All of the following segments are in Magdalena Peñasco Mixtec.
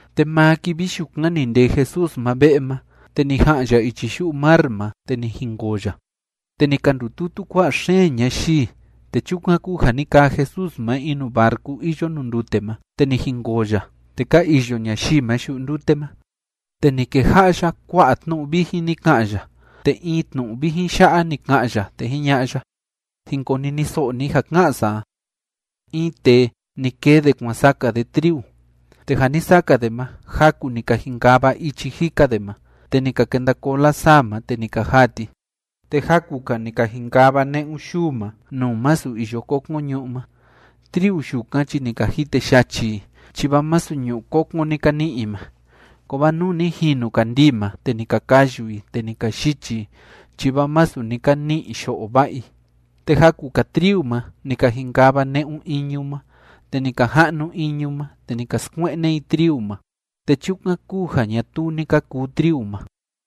Te maa kivi yukan ni ndee Jesús ma ve'e ma, te ni ja'an ya ichi yu'u mar ma, te ni jinkoo ya. Te ni ka ndututu kua'a xeen ñayii, te chukan kúu ja ni kaa Jesús ma in nuu barcu iyo nuu ndute ma, te ni jinkoo ya, te ka iyo ñayii ma yu'u ndute ma. Te ni keja'a ya kua'a tnu'u vijin ni ka'an ya, te in tnu'u vijin ya'a ni ka'an ya, te jiña'a ya: ―Jin koniniso'o ni ja ká'an sa a. In tee, ni kee de kuan saka de triu. Te ja ni saka de ma, jaku ni ka jinkava ichi jika de ma, te ni ka kenda koo lasaa ma, te ni ka jaa ti. Te jaku‑ka ni ka jinkava ne'un yuu ma, nuu masu iyo kokon ñu'ú ma. Triu yukan chi ni ka jite yachi i, chi vaa masu ñu'ú kokon ni ka ni'i i ma. Kovaa nuu ni jinu kandii ma, te ni ka kayu i, te ni ka yichi i, chi vaa masu ni ka ni'i yo'o va'a i. Te jaku‑ka triu ma ni ka jinkava ne'un iñu ma, te ni ka ja'nu iñu ma, te ni ka skue'ne i triu ma. Te chukan kúu ja ñatuu ni ka kuu triu ma.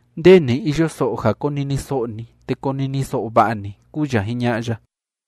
Nde ni iyo so'o ja koniniso'o ni, te koniniso'o va'a ni ―kúu ya jiña'a ya.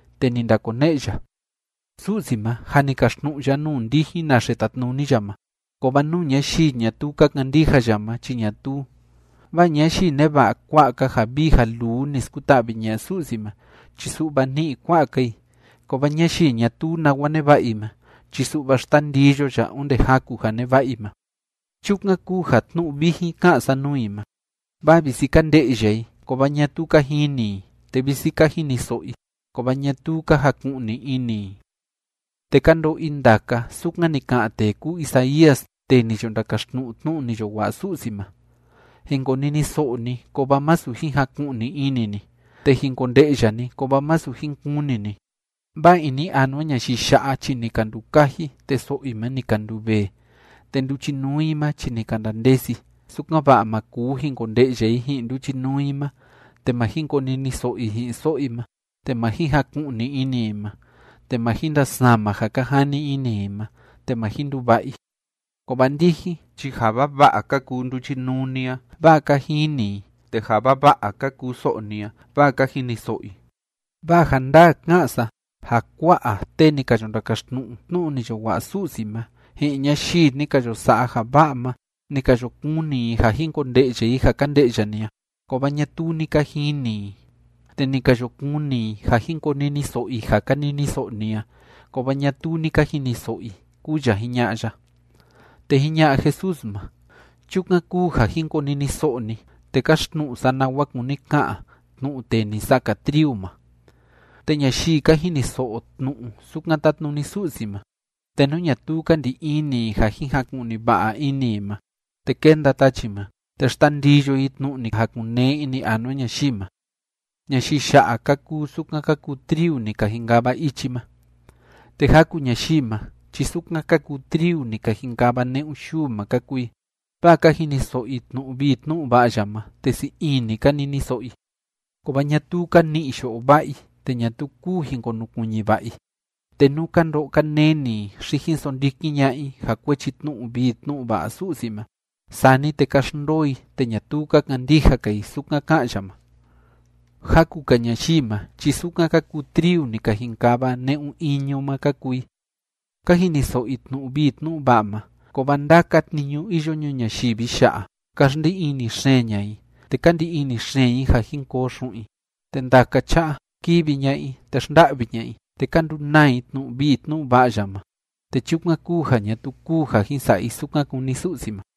Te ni ndakone'e ya: ―Su'si ma, jâ ni kaxtnu'u ya nuu ndijin naxe tatnuni ya ma. Kovaa nuu ñayii ñatuu ka kandija ya ma chi ñatuu. Vaa ñayii neva'a kua'a‑ka ja vii ja luu ni skuta'vi ña'a Su'si ma chi su'va ni'i kua'a‑ka i, kovaa ñayii ñatuu nawa neva'a i ma chi su'va xtandiyo ya onde jaku ja neva'a i ma. Chukan kúu ja tnu'u vijin ká'an sa nuu i ma, vaa visi ka nde'ya i, kovaa ñatuu ka jini i, te visi ka jiniso'o i, kovaa ñatuu ka jaku'ni ini i. Te ka ndo'o i ndaka sukan ni ka'an tee kúu Isaías tee ni yo ndakaxtnu'u tnu'u ni yo wa'a Su'si ma: Jin koniniso'o ni, kovaa masu jin jaku'ni ini ni. Te jin konde'ya ni, kovaa masu jin kuni ni. Vaa ini anua ñayii ya'a chi ni ka ndukaji, te so'o i ma ni ka nduvee, te nduchinuu i ma chi ni ka ndandesi, sukan‑va'a ma kuu jin konde'ya i ji'in nduchinuu i ma, te ma jin koniniso'o i ji'in so'o i ma, te ma jin jaku'ni ini i ma, te ma jin ndasama ja ka jani ini i ma, te ma jin nduva'a i. ’Kovaa ndijin chi ja vava'a ka kuu nduchinuu ni a, vaa ka jini i, te ja vava'a ka kuu so'o ni a, vaa ka jiniso'o i. Vaa ja ndaa ká'an sa ja kua'a tee ni ka yo ndakaxtnu'u tnu'u ni yo wa'a Su'si ma, ji'in ñayii ni ka yo sa'a ja va'a ma, ni ka yo kuni i ja jin konde'ya i ja ka nde'ya ni a, kovaa ñatuu ni ka jini i, te ni ka yo kuni i ja jin koniniso'o i ja ka niniso'o ni a, kovaa ñatuu ni ka jiniso'o i ―kúu ya jiña'a ya. Te jiña'a Jesús ma: ―Chukan kúu ja jin koniniso'o ni, te káxtnu'u sa nawa kúni ka'an tnu'u tee ni saka triu ma. Te ñayii ka jiniso'o tnu'u sukan tátnuni Su'si ma, te nú ñatuu ka ndi ini i ja jin jaku'ni va'a ini i ma, te kénda tachi ma, te xtandiyo i tnu'u ni jakun‑nee ini anua ñayii ma. Ñayii ya'a ka kuu sukan ka kuu triu ni ka jinkava ichi ma. Te jaku ñayii ma chi sukan ka kuu triu ni ka jinkava ne'un yuu ma ka kuu i. Vaa ka jiniso'o i tnu'u vii tnu'u va'a ya ma, te sii ini ka niniso'o i. Kovaa ñatuu ka ni'i yo'o va'a i, te ñatuu kuu jin konukuiñi va'a i. Te nú ka ndo'o ka neni i, xi jin sondikin ña'a i ja kuechi tnu'u vii tnu'u va'a Su'si ma, sani te ka xndoo i te ñatuu ka kandija‑ka i sukan ká'an ya ma. Jaku‑ka ñayii ma chi sukan ka kuu triu ni ka jinkava ne'un iñu ma ka kuu i. Ka jiniso'o i tnu'u vii tnu'u va'a ma, kovaa ndaka tniñu iyo ñuu ñayivi ya'a, ka xndi ini xeen ña'a i, te ka ndi ini xeen i ja jin koo xu'un i, te ndaka cha'a, kívi ña'a i te xnda'vi ña'a i, te ka ndunaa i tnu'u vii tnu'u va'a ya ma, te chukan kúu ja ñatuu kuu ja jin sa'a i sukan kúni Su'si ma.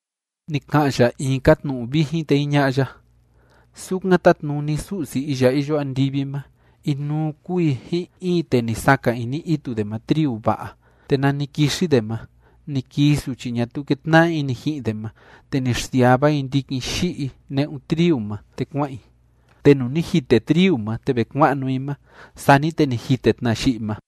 Ni ka'an ya in‑ka tnu'u vijin, te jiña'a ya: ―Sukan tátnuni Su'si iya iyo andivi ma, inuu kúu i ji'in in tee ni saka ini itu de ma triu va'a. Te nani kixi de ma, ni kii suchi ñatuu kétna'a ini ji'in de ma, te ni xsiava i ndikin yi'i ne'un triu ma, te kua'an i. Te nuu ni jite triu ma te ve kua'nu i ma, sani te ni jite tna yi'i ma.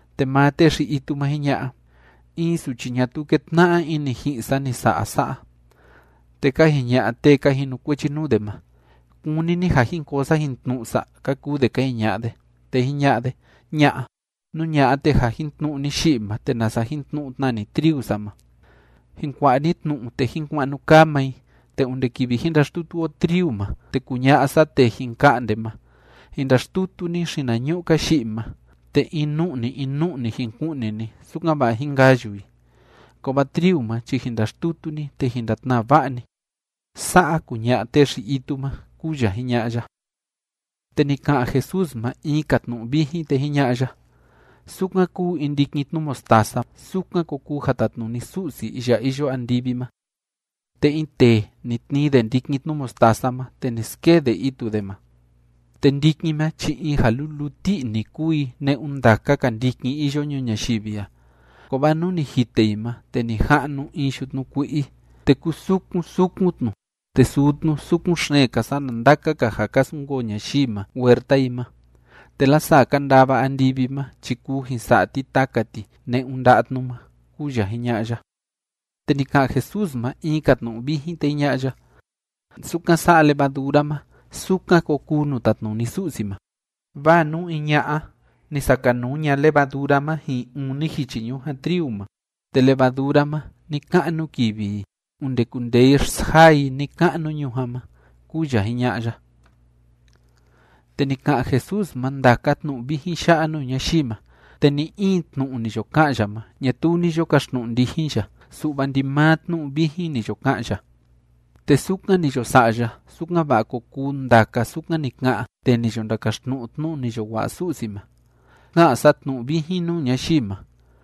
Te maa tee xi‑itu ma jiña'a: “In suchi ñatuu kétna'a ini ji'in sa ni sa'a sa'a.” Te ka jiña'a tee ka jinukuechi nuu de ma: “¿Kúni ni ja jin koo sa jin tnu'u sa?”, ka kuu de ka jiña'a de. Te jiña'a de: “Ña'a. Nú ña'a, te ja jin tnu'u ni yi'i ma, te nasa jin tnu'u tna ni triu sa ma. Jin kua'a ni tnu'u, te jin kua'nu kaa maa i te onde kivi jin ndaxtutu o triu ma, te kuña'a sa tee jin ka'nde ma: Jin ndaxtutu ni xinañu'u‑ka yi'i ma, te in nu'ni in nu'ni jin ku'ni ni, sukan‑va'a jín kayu i. Kovaa triu ma chi jin ndaxtutu ni, te jin ndatnaa va'a ni.” Sa'a kuña'a tee xi‑itu ma ―kúu ya jiña'a ya. Te ni ka'an Jesús ma in‑ka tnu'u vijin, te jiña'a ya: ―Sukan kúu in ndikin tnu mostaza, sukan ko kuu ja tatnuni Su'si iya iyo andivi ma. Te in tee, ni tnii de ndikin tnu mostaza ma, te ni skee de itu de ma. Te ndikin ma chi in ja luluu ti'i‑ni kúu i ne'un ndaka‑ka ndikin iyo ñuu ñayivi a, kovaa nuu ni jite i ma, te ni ja'nu in yutnu kui'i, te kúu sukun sukun tnu, te suu tnu sukun xeen‑ka sana ndaka‑ka ja ka sunkoo ñayii ma nuu huerta i ma, te lasaa ka ndava andivi ma chi kuu jin sa'a ti taka ti ne'un nda'a tnu ma ―kúu ya jiña'a ya. Te ni ka'an Jesús ma in‑ka tnu'u vijin, te jiña'a ya: ―Sukan sa'a levadura ma, sukan ko kuu nuu tatnuni Su'si ma. Vaa nú in ña'a, ni sakanuu ña levadura ma ji'in uni jichi ñujan triu ma, te levadura ma ni‑ka'nu kivi i, onde kundee i xsjaa i ni‑ka'nu ñujan ma ―kúu ya jiña'a ya. Te ni ka'an Jesús ma ndaka tnu'u vijin ya'a nuu ñayii ma. Te ni‑in tnu'u ni yo ka'an ya ma ñatuu ni yo kaxtnu'u ndijin ya, su'va ndimaa tnu'u vijin ni yo ka'an ya. Te sukan ni yo sa'a ya, sukan‑va'a ko kuu ndaka sukan ni ka'an tee ni yo ndakaxtnu'u tnu'u ni yo wa'a Su'si ma: Ka'an sa tnu'u vijin nuu ñayii ma.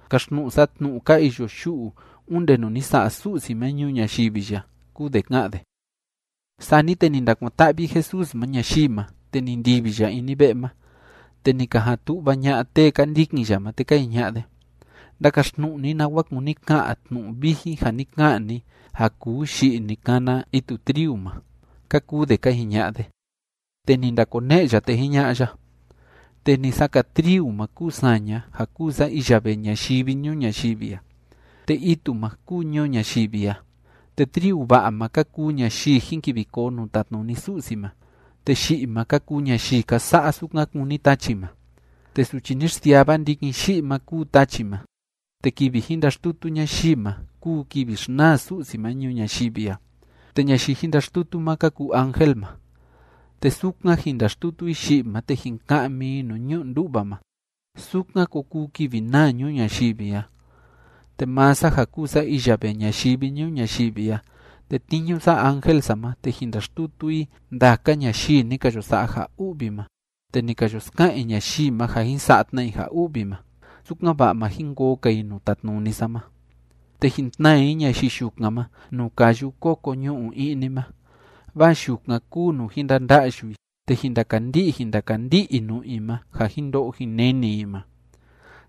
Kaxtnu'u sa tnu'u ka iyo yu'u onde nuu ni sa'a Su'si ma ñuu ñayivi ya, kúu de ká'an de. Sani te ni ndakuan‑ta'vi Jesús ma ñayii ma, te ni ndivi ya ini ve'e ma. Te ni ka jan tu'va ña'a tee ka ndikin ya ma, te ka jiña'a de: ―Ndakaxtnu'u ni nawa kúni ka'an tnu'u vijin ja ni ka'an ni ja kuu yi'i ni kana itu triu ma ―ka kuu de ka jiña'a de. Te ni ndakone'e ya, te jiña'a ya: ―Tee ni saka triu ma kúu saña, ja kúu sa iya vee ñayivi ñuu ñayivi a. Te itu ma kúu ñuu ñayivi a. Te triu va'a ma ka kuu ñayii jin kivi koo nuu tatnuni Su'si ma, te yi'i ma ka kuu ñayii ka sa'a sukan kúni tachi ma. Te suchi ni xsiava ndikin yi'i ma kúu tachi ma, te kivi jin ndaxtutu ñayii ma kúu kivi xnaa Su'si ma ñuu ñayivi a. Te ñayii jin ndaxtutu ma ka kuu ángel ma. Te sukan jin ndaxtutu i yi'i ma te jin ka'mi i nuu ñu'u ndú'va ma, sukan ko kuu kivi naa ñuu ñayivi a. Te maa sa ja kúu sa iya vee ñayivi ñuu ñayivi a, tetniñu sa ángel sa ma, te jin ndaxtutu i ndaka ñayii ni ka yo sa'a ja u'vi ma te ni ka yo ska'an i ñayii ma ja jin sa'a tna i ja u'vi ma, sukan‑va'a ma jin koo‑ka i nuu tatnuni sa ma. Te jin tnaa i ñayii yukan ma nuu káyu kóko ñu'u i'ni ma, vaa yukan kúu nuu jin ndanda'yu i, te jin ndakandi'i jin ndakandi'i i nu'u i ma ja jin ndo'o jin neni i ma.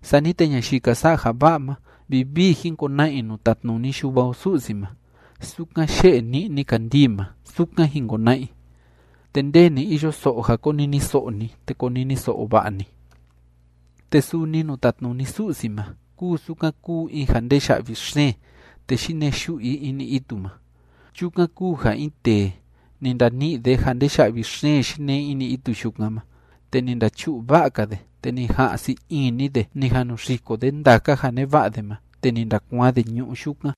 Sani te ñayii ka sa'a ja va'a ma, vivii jin kona'a i nuu tatnuni Yuva o Su'si ma, sukan yé'e ni'ni kandii ma, sukan jin kona'a i. ’Te nde ni iyo so'o ja koniniso'o ni, te koniniso'o va'a ni. ’Te suni nuu tatnuni Su'si ma kúu sukan kúu in ja ndee ya'vi xeen, te yinee yu'u i ini itu ma. Chukan kúu ja in tee, ni ndani'i de ja ndee ya'vi xeen yinee ini itu yukan ma, te ni ndachu'u va'a‑ka de, te ni ja'an sii ini de ni jan nu xiko de ndaka ja neva'a de ma, te ni ndakuaan de ñu'ú yukan.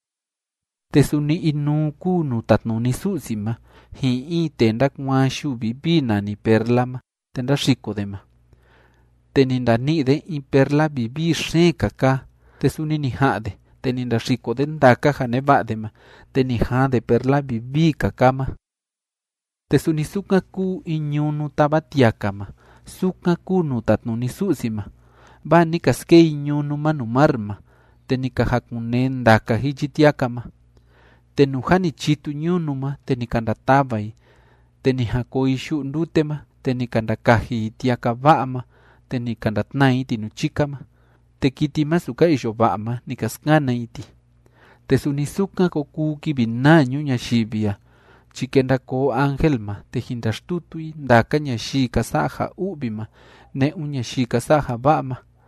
’Te suni inuu kúu nuu tatnuni Su'si ma ji'in in tee ndákuaan yuu vivii nani perla ma te ndáxiko de ma. Te ni ndani'i de in perla vivii xeen‑ka kaa, te suni ni ja'an de, te ni ndaxiko de ndaka ja neva'a de ma, te ni jaan de perla vivii‑ka kaa ma. ’Te suni sukan kúu in ñunu táva tiaka ma, sukan kúu nuu tatnuni Su'si ma, vaa ni ka skee i ñunu ma nuu mar ma, te ni ka jakun‑nee ndaka jichi tiaka ma. Te nuu jâ ni chitu ñunu ma, te ni ka ndatava i. Te ni jan koo i yu'u ndute ma, te ni ka ndakaji i tiaka va'a ma, te ni ka ndatnaa i ti nuu chika ma. Te kiti masu ka iyo va'a ma, ni ka skana i ti. Te suni sukan ko kuu kivi naa ñuu ñayivi a chi kenda koo ángel ma, te jin ndaxtutu i ndaka ñayii ka sa'a ja u'vi ma ne'un ñayii ka sa'a ja va'a ma.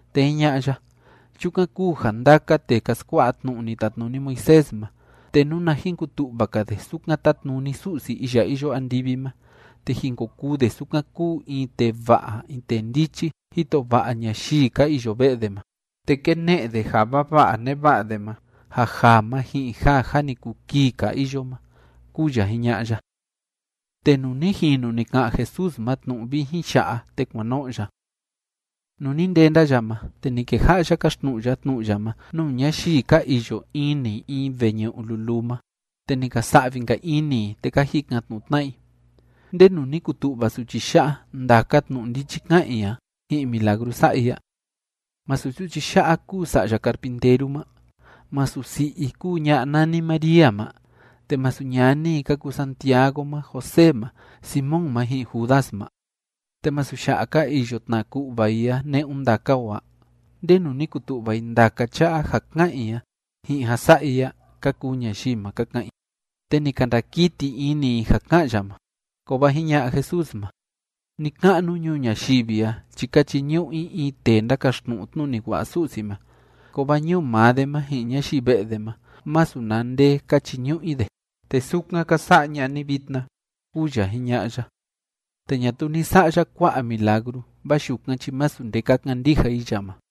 Te jiña'a ya: ―Chukan kúu ja ndaka tee ka skua'a tnu'u ni tatnuni Moisés ma, te nuna jin kutu'va‑ka de sukan tátnuni Su'si iya iyo andivi ma, te jin ko kuu de sukan kúu in tee va'a in tee ndichi jito va'a ñayii ka iyo ve'e de ma, te kéne'e de ja vava'a neva'a de ma, ja jaa ma ji'in ja jâ ni kuu kii‑ka iyo ma ―kúu ya jiña'a ya. Te nuu ni jinu ni ka'an Jesús ma tnu'u vijin ya'a, te kuan no'o ya. Nuu ni ndenda ya ma, te ni keja'a ya káxtnu'u ya tnu'u ya ma nuu ñayii ka iyo ini in veñu'u luluu ma. Te ni ka sa'vi‑nka ini i, te ka jikan‑tnu'u tna'a i: ―¿Ndenu ni kutu'va suchi ya'a ndaka tnu'u ndichi ká'an i a ji'in milagru sa'a i a? ¿Masu suchi ya'a kúu sa'ya carpinteru ma? ¿Masu si'i i kúu ña'a nani María ma? ¿Te masu ñani i ka kuu Santiago ma, José ma, Simón ma, ji'in Judas ma? ¿Te masu ya'a ka iyo tna ku'va i a ne'un ndaka o a? ¿Ndenu ni kutu'va i ndaka cha'a ja ká'an i a ji'in ja sa'a i a? ―ka kuu ñayii ma ka ka'an i. Te ni ka ndakiti ini i ja ká'an ya ma. Kovaa jiña'a Jesús ma: ―Ni‑ka'nu ñuu ñayivi a chi ka chiñu'u i in tee ndákaxtnu'u tnu'u ni wa'a Su'si ma, kovaa ñuu maa de ma ji'in ñayii ve'e de ma, masu na nde ka chiñu'u i de. Te sukan ka sa'a ña'a ni vitna ―kúu ya jiña'a ya. Te ñatuu ni sa'a ya kua'a milagru vaa yukan chi masu nde ka kandija i ya ma.